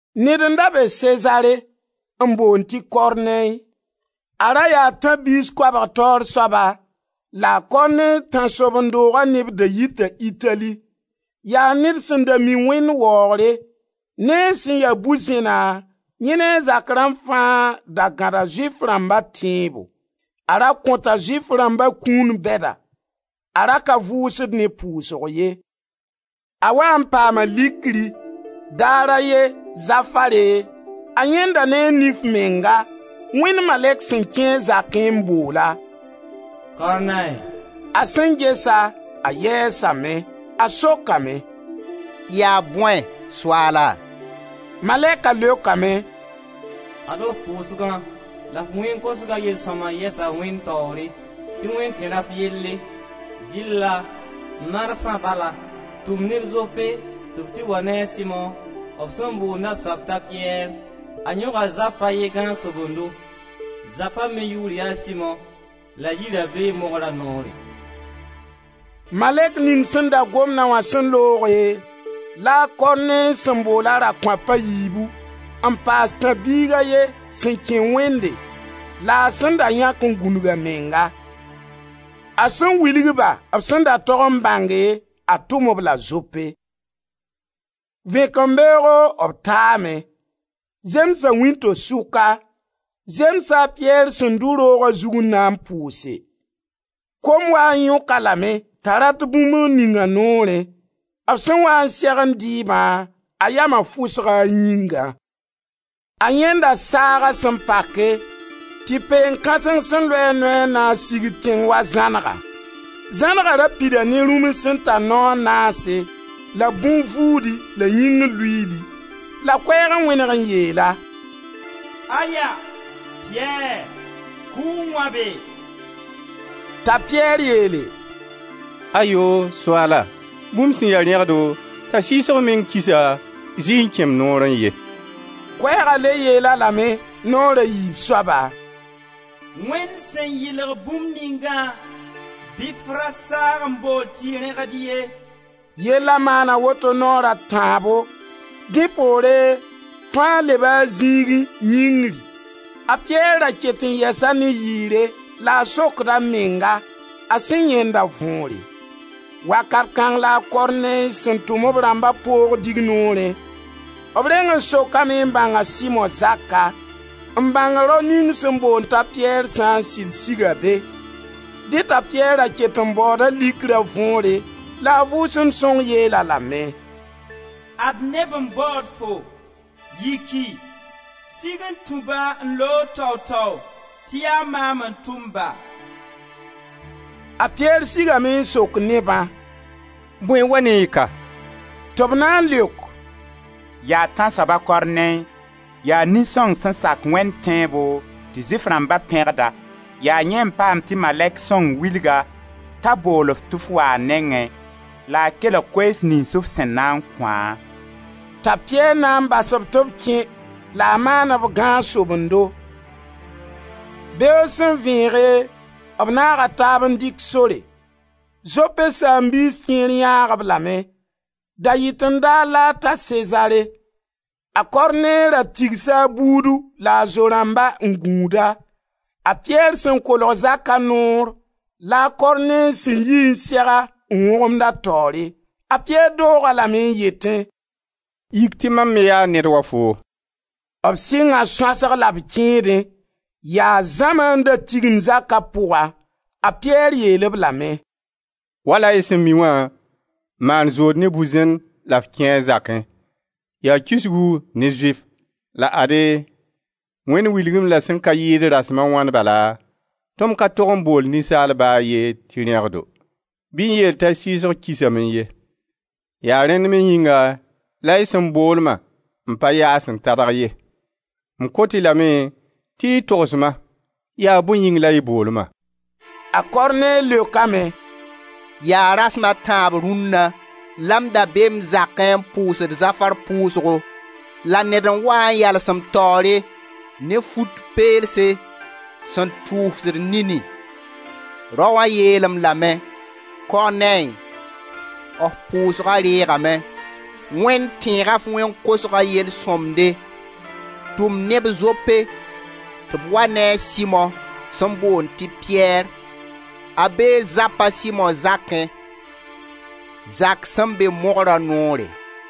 Ned n da be Sezare n boond tɩ Kornɛy. A ra yaa tãb-biis koabg taoor soaba, la Kornɛy tãnsoben-dooga neb da yita Itali. Yaa ned sẽn da mi Wẽnd waoogre: ne a sẽn ya bu-zẽna, yẽ ne a zak rãmb fãa da gãda Zʋɩf rãmba tẽebo. A ra kõta Zʋɩf rãmba kũun bɛda. A ra ka vʋsd ne pʋʋsg ye. A waa n paama likri. Daar a ye, zafare, a yãenda ne a nif menga, Wẽnd malɛk sẽn kẽ a zakẽ n bool-a: «Kornɛy!» A sẽn ges-a, a yɛɛsame. A sokame: «Yaa bõe, Soaala?» Malɛka leokame: «Ad-f pʋʋsgã la f wẽn-kosgã yel-sõmda yɛsa Wẽnd taoore, tɩ Wẽnd tẽr f yelle. Dɩlla marsã bala tʋm neb Zope tɩ b tɩ wa ne a Simo, b sẽn boonda soab t'a Piyɛr. A yõga zap a ye gãag-sobendo. Zapa me yʋʋr yaa Simo la a yira bee mogra noore.» Malɛk ning sẽn da gomda wã sẽn looge, la a Kornɛy sẽn bool a rakõap a yiibu n paas tãb-biig a ye sẽn kẽ Wẽnde la a sẽn da yãk n gũnug a menga. A sẽn wilg-ba b sẽn da tog n bãnge, a tʋm-b la Zope. Vẽkembeoogo b taame. Zemsa wĩnto-suka, zemsa a Piyɛr sẽn dʋ rooga zug n na n pʋʋse. Kom waa n yõk-a lame t'a rat bũmb n ning a noorẽ. B sẽn waa n segend dɩɩbã, a yama fʋsga a yĩngã. A yãenda saaga sẽn pake tɩ peen kãseng sẽn loe a noy a naas sigd tẽng wa zãnega. Zãnega ra pida ne rũms sẽn tar nao a naase la bõn-vuudi la yĩngr luiili. La koɛɛg n wẽneg n yeel-a: «Aya! Piyɛr, kʋ n wãbe.» T'a Piyɛr yeele: «Ayo! Soaala, bũmb sẽn ya rẽgdo, t'a sɩɩsg meng kisa, zɩɩ n kẽ m noorẽ ye.» Koɛɛga le yeel-a lame, naoor a yiib soaba: «Wẽnd sẽn yɩlg bũmb ningã bɩ f ra saag n bool tɩ rẽgd ye.» Yella maana woto naoor a tãabo. Dẽ poore, fãa leba a zĩigẽ, yĩngri. A Piyɛr ra ket n yɛsa ne yɩɩre la a sokd a menga a sẽn yãenda võore. Wakat kãng la a Kornɛy sẽn tʋm b rãmba poog dignoorẽ. B reng n sokame n bãng a Simo zaka, n bãng rao ning sẽn boond t'a Piyɛr sã n sɩd siga be. Dẽ t'a Piyɛr ra ket n baooda likra võore la a Vʋʋsem Sõng yeel-a lame: «Ad neb n baood-fo. Yiki, sig n tũ-ba n looge tao-tao tɩ yaa maam n tʋm-ba.» A Piyɛr sigame n sok nebã: «Bõe n wa ne y ka?» Tɩ b na n leok: «Yaa Tãnsoab a Kornɛy, yaa nin-sõng sẽn sak Wẽnd tẽebo tɩ Zʋɩf rãmba pẽgd-a, yaa yẽ n paam tɩ malɛk sõng wilg-a t'a bool-f tɩ f waa a nengẽ la a kelg koees niyns f sẽn na n kõ-a.» T'a Piyɛr na n bas-b tɩ b kẽ la a maan-b gãag-sobendo. Beoog sẽn vẽege, b naaga taab n dɩk sore; Zope saam-biis kẽer yãag-b lame. Da-yɩten-daar la a ta Sezare. A Kornɛy ra tigsa a buudu la a zo-rãmba n gũud-a. A Piyɛr sẽn kolg zaka noor la a Kornɛy sẽn yi n seg-a n wõgemd a taoore. A Piyɛr doog-a lame n yetẽ: «Yik tɩ mam me yaa ned wa foom.» B sɩnga sõasg la b kẽedẽ. Yaa zãma n da tigim zaka pʋga. A Piyɛr yeel-b lame: «Wala y sẽn mi wã, maan zood ne bu-zẽn la f kẽe a zakẽ, yaa kisgu ne Zʋɩf. La ade, Wẽnd Wilg-m-la sẽn ka yɩɩd rasem a wãn bala tɩ m ka tog n bool ninsaal ba a ye tɩ rẽgdo, bɩ n yeel t'a sɩɩsg kisame ye. Yaa rẽnd me yĩnga la y sẽn bool-ma m pa yaas n tadg ye. M kot-y lame tɩ y togs-ma: yaa bõe yĩng la y bool-ma?» A Kornɛy leokame: «Yaa rasem a tãab rũnna la m da be m zakẽ n pʋʋsd zafar pʋʋsgo la ned n waa n yals m taoore ne fut peelem sẽn tʋʋsd nini. Raoã yeel-m lame: ‹Kornɛy, f pʋʋsga reegame, Wẽnd tẽega f wẽn-kosga yel-sõmde. Tʋm neb Zope tɩ b wa ne a Simo sẽn boond tɩ Piyɛr. A bee zap a Simo zakẽ, zak sẽn be mogra noore.›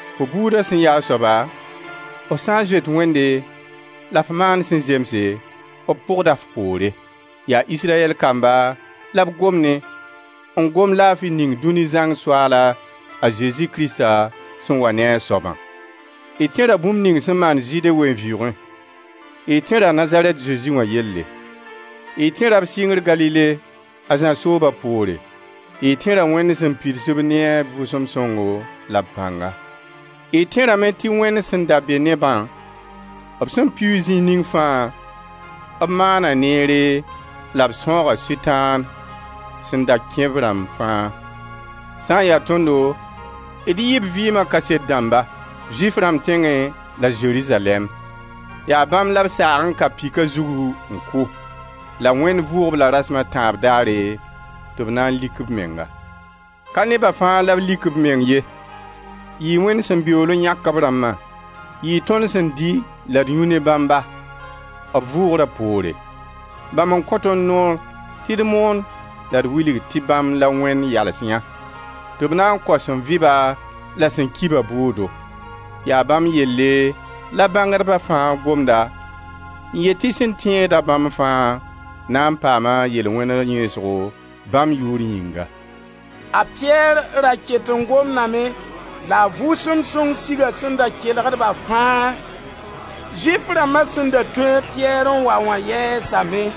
Fo buuda sẽn yaa soaba, f sã n zoet Wẽnde la f maand sẽn zemse, b pʋgda f poore. Yaa Israyɛl kamba la b gom ne, n gom laafi ning Dũni zãng Soaala, a Zezi Krista, sẽn wa ne a soabã. Y tẽra bũmb ning sẽn maan Zɩɩde ween-vɩʋʋgẽ. Y tẽra Nazarɛt Zezi wã yelle. Y tẽra b sɩngr Galile, a Zã sooba poore. Y tẽra Wẽnd sẽn pids-b ne a Vʋʋsem Sõngo la b pãnga. Y tẽra me tɩ Wẽnd sẽn da be ne-bã, b sẽn pɩʋʋg zĩig ning fãa b maana neere la b sãooga Sʋtãan sẽn da kẽ b rãmb fãa. Sã n ya tõndo, d yɩɩ b vɩɩma kaset dãmba, Zʋɩf rãmb tẽngẽ la Zerizalɛɛm. Yaa bãmb la b saag n ka pika zugu n kʋ. La Wẽnd vʋʋg-b la rasem a tãab daare tɩ b na lik b menga. Ka neba fãa la b lik b meng ye, yɩɩ Wẽnd sẽn beool n yãk b rãmba. Yɩɩ tõnd sẽn dɩ la d yũ ne bãmba, b vʋʋgra poore. Bãmb n kõ tõnd noor tɩ d moon la d wilg tɩ bãmb la Wẽnd yals yã tɩ b na n kao sẽn vɩ-ba la sẽn ki-ba bʋʋdo. Yaa bãmb yelle la bãngdba fãa gomda n yet tɩ sẽn tẽed-a bãmb fãa na paam a yel-wẽna yẽesgo bãmb yʋʋr yĩnga.» A Piyɛr ra ket n gomdame la a Vʋʋsem Sõng siga sẽn da kelgd-ba fãa. Zʋɩf rãmba sẽn da tũ a Piyɛr n wa wã yɛɛsame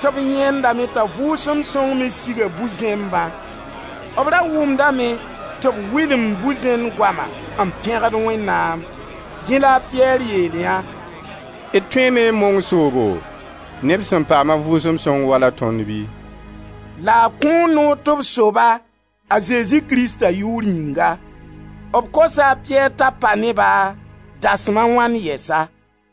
tɩ b yãendame t'a Vʋʋsem Sõng me siga bu-zẽmbã. B ra wʋmdame tɩ b wɩlemd bu-zẽn goama n pẽgd Wẽnnaam. Dẽ la a Piyɛr yeel yã: «D tõeeme n mong soobo, neb sẽn paam a Vʋʋsem Sõng wala tõnd bɩ?» La a kõo noor tɩ b so-ba, a Zezi Krista yʋʋr yĩnga. B kosa a Piyɛr t'a pa ne-ba dasem a wãn yɛsa.